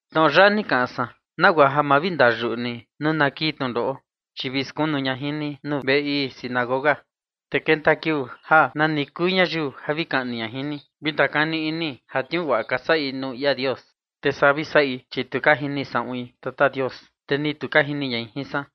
’Tnoꞌo yaꞌa ni kaꞌan san, nagua ja ma vi ndayuꞌu ni nuu na kii tnundoꞌo. Chi vi skunu ña jin ni nuu veꞌe ii sinagoga. Te kenta kiuu ja nani kuu ñayiu ja vi kaꞌni ña jin ni, vi ndakani ini ja tniuu guaꞌa ka saꞌi nuu ia Dios. Te saa vi saꞌi, chi tu ka jini saꞌuin Tata Dios, te ni tu ka jini ñai jin san.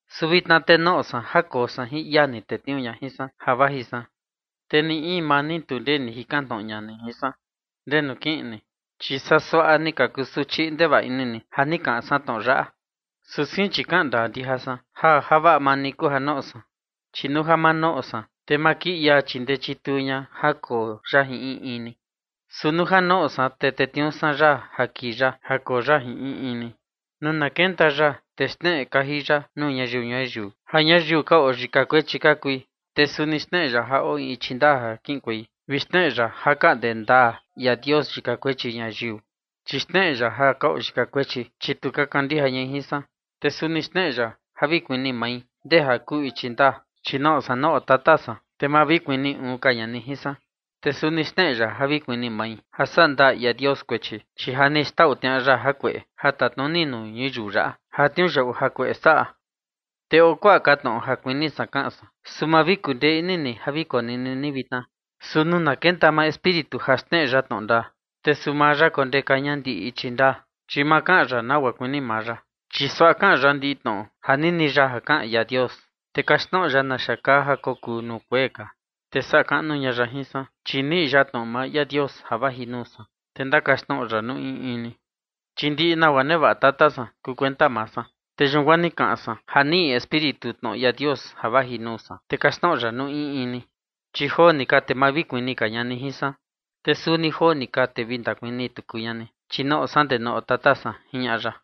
Su vitna te noꞌo san ja koo san jin ia ni tetniuu ña jin san ja vaji san. Te ni in maa ni, tu ndee ni jikan tnoꞌo ña jin san: “¿Ndenu kiꞌin ni?” Chi saa suaꞌa ni ka kusuchi ndevaꞌa ini ni, ja ni kaꞌan san tnoꞌo yaꞌa. Su sein, chi kaꞌan ndaa ndija san ja javaꞌa maa ni kuu ja noꞌo san. Chi nuu ja ma noꞌo san, te ma kii ia chindee chituu ña ja koo ya jin in in ni. Su nuu ja noꞌo san, te tetniuu san ya kii ya ja koo ya jin in in ni. Nuu na kenta ya, te xneꞌe kaji ya nuu ñayiu ñuyiu ja ñayiu ka oo yika kuechi ka kui, te suni xneꞌe ya ja oo in ichi ndaa ja kiꞌinkuei, vi xneꞌe ya ja kaꞌnde ndaa ia Dios yika kuechi ñayiu. Chi xneꞌe ya ja ka oo yika kuechi, chi tu ka kandija ñai jin san. Te suni xneꞌe ya ja vi kuni mai ndee ja kuu ichi ndaa, chi noꞌo san nuu oo Tata san, te ma vi kuni uun ka ña ni jin san. Te suni xneꞌe ya ja vi kuni mai, ja saꞌa ndaa ia Dios kuechi, chi ja ni xtau tniaꞌa ya jakueꞌe ja tatnuni nuu ñuyiu yaꞌa ja tniuyaꞌu jakueꞌe saꞌa. ’Te oo kuaꞌa ka tnoꞌo ja kuini san kaꞌan san, su ma vi kundee ini ni ja vi konini ni vitna. Su nuu na kenta maa Espíritu ja xneꞌe ya tnoꞌo ndaa, te suu maa ya kondeka ña ndiꞌi ichi ndaa, chi ma kaꞌan ya nagua kuini maa ya, chi suaꞌa kaꞌan ya ndiꞌi tnoꞌo ja nini ya kaꞌan ia Dios, te kaxtnoꞌo ya naxa kaa ja kokuu nuu kuee ka. Te saꞌa kaꞌnu ña ya jin san, chi niꞌi ya tnoꞌo maa ia Dios ja vaji nuu san, te ndakaxtnoꞌo ya nuu in in ni. Chi ndiꞌi nagua nevaꞌa Tata san kuu kuenta maa san, te yun guaa ni kaꞌan san ja niꞌi Espíritu tnoꞌo ia Dios ja vaji nuu san, te kaxtnoꞌo ya nuu in in ni. Chi joo ni ka, te ma vi kuni ka ña ni jin san, te suni joo ni ka, te vi ndakuni tuku ña ni, chi noꞌo san ndee nuu oo Tata san ―jiñaꞌa ya.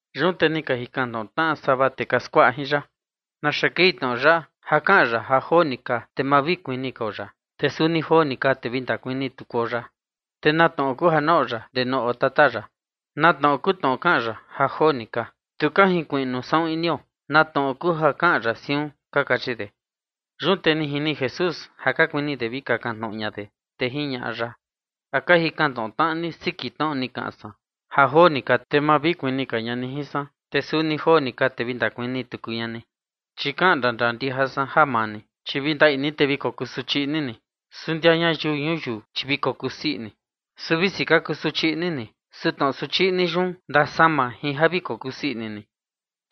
Yun te ni ka jikan tnoꞌo tnaꞌa sava tee ka skuaꞌa jin ya: ―¿Naxa kei tnoꞌo yaꞌa ja kaꞌan ya ja joo ni ka, te ma vi kuni kao ya, te suni joo ni ka, te vi ndakuni tukuo ya? ¿Te na tnoꞌo kuu ja noꞌo ya ndee nuu oo tata ya? ¿Na tnoꞌo kuu tnoꞌo kaꞌan ya “ja joo ni ka”? Tu ka junkuiꞌnu saꞌun inio na tnoꞌo kuu ja kaꞌan ya siun ―ka kachi de. Yun te ni jini Jesús ja ka kuini de vi kakan tnoꞌo ña de, te jiñaꞌa ya: ―¿A ka jikan tnoꞌo tnaꞌa ni siki tnoꞌo ni kaꞌan san: “Ja joo ni ka, te ma vi kuni ka ña ni jin san, te suni joo ni ka, te vi ndakuni tuku ña ni”? Chi kaꞌan ndandaa ndija san ja maa ni, chi vi ndaꞌi ni, te vi kokusuchi ini ni, su ndia ñayiu ñuyiu, chi vi kokusii ini. Su visi ka kusuchi ini ni, su tnoꞌo suchi ini yun ndasama jin ja vi kokusii ini ni.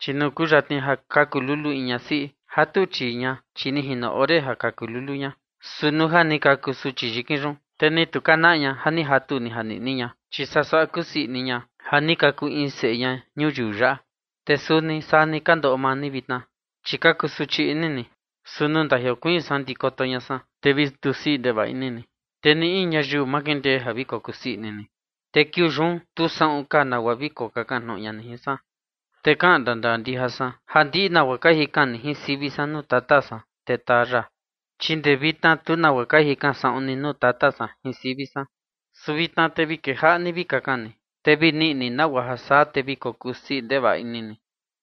Chi nuu kuyatni ja kaku lulu in ñasiꞌi, jatu chii ña, chi ni jino ore ja kaku lulu ña. Su nuu ja ni kaku suchi yikin yun, te ni tu ka naꞌa ña ja ni jatu ni janiꞌni ña, chi saa suaꞌa kusii ini ña ja ni kaku in seꞌe ña ñuyiu yaꞌa. Te suni saa ni ka ndoꞌo maa ni vitna, chi ka kusuchi ini ni, su nuu ndajiokuiin san ndikoto ña san, te vi ndusii ndevaꞌa ini ni, te ni in ñayiu ma kindee ja vi kokusii ini ni. Te kiuu yun, tu saꞌun ka nagua vi kokakan tnoꞌo ña ni jin san. Te kaꞌan ndandaa ndija san ja ndiꞌi nagua ka jikan ni jin sivi san nuu Tata san, te taa ya. Chi guaa ndee vitna tu nagua ka jikan saꞌun ni nuu Tata san jin sivi san. Su vitna te vi kejaꞌa ni vi kakan ni, te vi niꞌi ni nagua ja saa, te vi kokusii ndevaꞌa ini ni.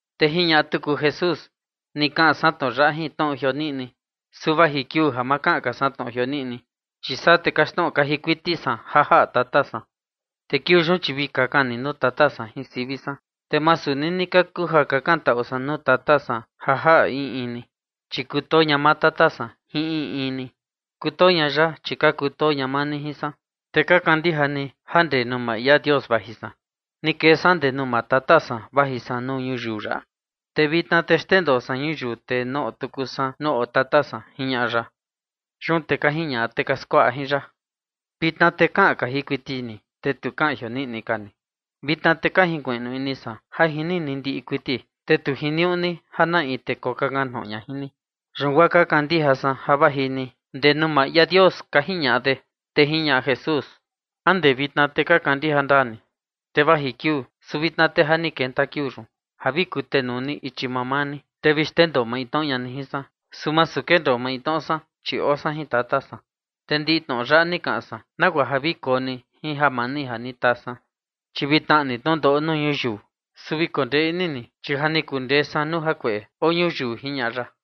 Te jiñaꞌa tuku Jesús: ―Ni kaꞌan san tnoꞌo yaꞌa jin tnoꞌo jioniꞌni. Su vaji kiuu ja ma kaꞌan ka san tnoꞌo jioniꞌni, chi saa te kaxtnoꞌo kaji kuiti san ja jaꞌa Tata san. Te kiuu yun, chi vi kakan ni nuu Tata san jin sivi san, te masu nini ka kuu ja kakantaꞌu san nuu Tata san ja jaꞌa in in ni. Chi kutoo ña maa Tata san jin in in ni. Kutoo ña ya, chi ka kutoo ña maa ni jin san, te ka kandija ni ja guaa ndee nuu maa ia Dios vaji san. Ni kee san guaa ndee nuu maa Tata san vaji san nuu ñuyiu yaꞌa, te vitna te xndendoo san ñuyiu, te noꞌo tuku san nuu oo Tata san ―jiñaꞌa ya. Yun te ka jiñaꞌa tee ka skuaꞌa jin ya: ―Vitna te kaꞌan kaji kuiti ni, te tu kaꞌan jioniꞌni ka ni. Vitna te ka jinkuiꞌnu ini san ja jini ni ndiꞌi kuiti, te tu jiniuꞌu ni ja na in tee kokakan tnoꞌo ña jin ni. Yun guaa ka kandija san ja vaji ni guaa ndee nuu maa ia Dios ―ka jiñaꞌa de. Te jiñaꞌa Jesús: ―¿A ndee vitna te ka kandija ndaa ni? Te vaji kiuu, su vitna te ja ni kenta kiuu yun, ja vi kutenuu ni ichi mamaa ni, te vi xndendoo maintnoꞌo ni ña ni jin san. Su masu kendoo maintnoꞌo san, chi oo san jin Tata san. Te ndiꞌi tnoꞌo yaꞌa ni kaꞌan san nagua ja vi koo ni jin jamani ja ni taa san. Chi vi tnaꞌa ni tnundoꞌo nuu ñuyiu, su vi kondee ini ni, chi ja ni kundee san nuu jakueꞌe oo ñuyiu ―jiñaꞌa ya.